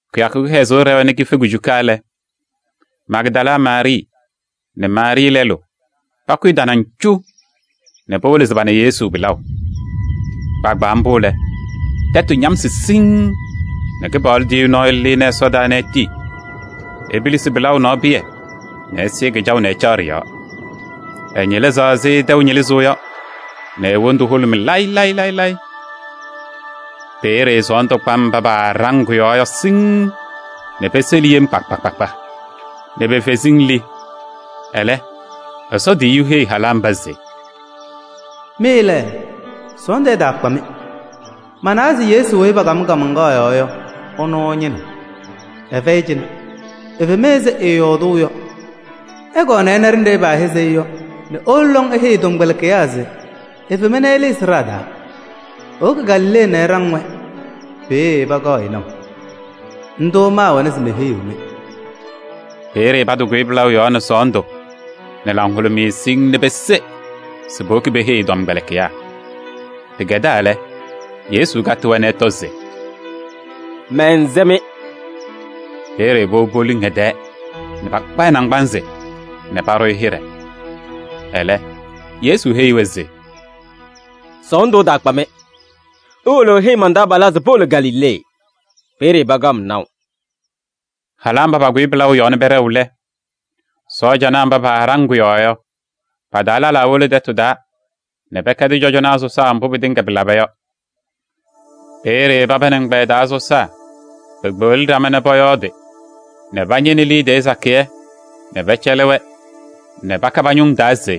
Kɩyakʋ kɩhɛzʋʋ ɖɛwa nɛ kife kujuka lɛ, Magdala Maarɩɩ nɛ Maarɩɩ lɛlʋ pakʋyɩ tanaŋ cu nɛ powolo se pana Yesu pɩlaʋ. Kpaagbaa mbʋ lɛ, tɛtʋ ñamsɩ siŋŋ nɛ Kɩpaɣlʋ tiyiyu nɔɔyʋ lɩnɩ ɛsɔdaa nɛ etii epilisi pɩlaʋ nɔɔ pɩyɛ nɛ ɛsɩɩ kɩjaʋ nɛ ɛcaɣ ɖɩ-yɔɔ. Ɛñɩlɩzaɣ ɛzɩ tɛʋ ñɩlɩzʋʋ yɔ nɛ e-wondu hʋlʋmɩ layɩ layɩ. Peeye sɔɔndʋ kpa mba paaɖaŋ kʋ-yɔɔ yɔ siŋŋ nɛ peseli yem kpa kpa kpa nɛ pe-feziŋ li. Ɛlɛ, Ɛsɔ tiyiyu heyi halaa mba se: “Mɩ lɛ, sɔɔndʋ ɛtaakpa-mɩ. Manawa se Yesu weyi paakam kaamaŋkaɣ yɔɔ yɔ, ɛnʋ ɩñɩnɩɣ. Ɛfɛyɩ cɩnɛ, efema ɛzɩ ɛɛyɔɔdʋʋ yɔ. Ɩkɔɔ ɩna ɖenɖe paahɛzɩ-ɩ yɔ nɛ iwolo lɔŋ iheyi ɛ-tɔmkpɛlɩkɩyaa se efema nɛ ɛlɩnɩ sɩɖaa taa. Ewoki Galilee nɛ ɛɖaŋ-wɛ, peeye pakaɣ-ɩ naʋ. Ndʋ maawɛna se meheyiɣ-mɩ.” Peeye patɩkʋyɩ pɩlaʋ yɔɔ nɛ sɔɔndʋ nɛ laŋhʋlʋmɩyɛ siŋŋ nɛ peseɣ se powoki peheyi ɛ-tɔmkpɛlɩkɩyaa. Pɩkɛdaa lɛ, Yesu katɩ-wɛ nɛ ɛtɔ se: “Mɛnsɛ-mɩ!” Peeye powobi poluŋ ɛ-tɛɛ nɛ pakpa ɛ-naŋgbanzɩ nɛ paɖʋ-ɩ hɩɖɛ. Ɛlɛ, Yesu heyi-wɛ se: “Sɔɔndʋ ɛtaakpa-mɩ. Iwolo iheyi man-taabalaa se powolo Galilee, peeye pakaɣ-m naʋ.” Halaa mba pakʋyɩ pɩlaʋ yɔɔ nɛ pɛɖɛɣ lɛ, sɔɔjanaa mba paɖaŋ kʋ-yɔɔ yɔ, pa-taa lɛlaa wolo tɛtʋ taa nɛ pɛkɛdɩ cɔjɔnaa sɔsaa mbʋ pɩtɩŋa pɩlaba yɔ. Peeye paba nɛ ɛgbɛyɛ taa sɔsaa pekpeɣli ɖama nɛ pɔyɔɔdɩ nɛ pañɩnɩ liidiye sakɩyɛ nɛ pɛcɛlɩ-wɛ nɛ paka pa-ñʋŋ taa se: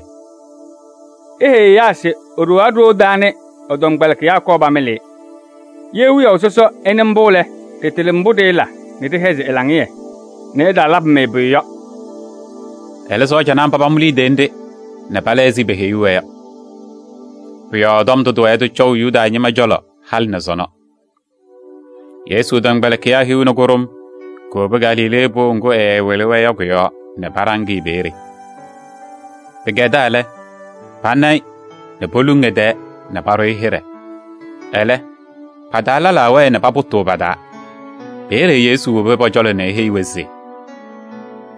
“Iheyi ɛyaa se iɖowaɣ ɖoo taa nɛ ɛ-tɔmkpɛlɩkɩyaa kɔɔ pamɩlɩ-ɩ. Ye wiyaʋ sɔsɔ ɛnɩ mbʋ lɛ, ɖɩtɩlɩ mbʋ ɖɩɩla nɛ ɖɩhɛzɩ ɛ-laŋɩyɛ nɛ ɛtaalabɩ-mɩ pʋyʋ yɔ.” Ɛlɛ sɔɔjanaa mba pamʋ liidiye nɖɩ nɛ pala ɛzɩ peheyuu-wɛ yɔ. Pʋ-yɔɔ tɔm ndʋ tɩwɛɛ tɩcɔʋ Yuda ñɩma cɔlɔ halɩ nɛ sɔnɔ. Yesu tɔmkpɛlɩkɩyaa hiu nɛ kʋɖʋm kowobi Galilee pʋʋ ŋgʋ ɛɛwɩlɩ-wɛ yɔ kʋ-yɔɔ nɛ paɖaŋ-ɩ peeye. Pɩkɛdaa lɛ, pana-ɩ nɛ poluŋ ɛ-tɛɛ nɛ paɖʋ-ɩ hɩɖɛ. Ɛlɛ, pa-taa lɛlaa wɛɛ nɛ papʋtʋʋ pa-taa. Peeye Yesu wobi pɔ-cɔlɔ nɛ eheyi-wɛ se: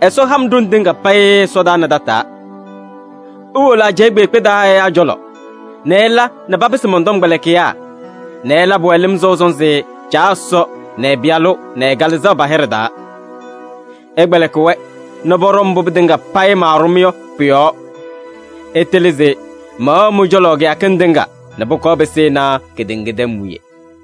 “Ɛsɔ ha-m ɖoŋ tɩŋa payɩ ɛsɔdaa nɛ tataa. Iwolo ajɛɛ kpeekpe taa ɛyaa cɔlɔ nɛ ɩla nɛ papɩsɩ mɔn-tɔmkpɛlɩkɩyaa nɛ ɩlabɩ-wɛ lɩm sɔʋ sɔnzɩ Caa Ɛsɔ nɛ ɛ-Pɩyalʋ nɛ ɛ-Kalɩzaɣ pa-hɩɖɛ taa. Ɩkpɛlɩkɩ-wɛ nɛ pɔɖɔ mbʋ pɩtɩŋa payɩ maaɖʋ-mɩ yɔ pʋ-yɔɔ. Ɩtɩlɩ se mɛwɛɣ mɩ-cɔlɔ kɩyakɩŋ tɩŋa nɛ pʋkɔɔ pɩsɩnɩ kedeŋa tɛm wiye.”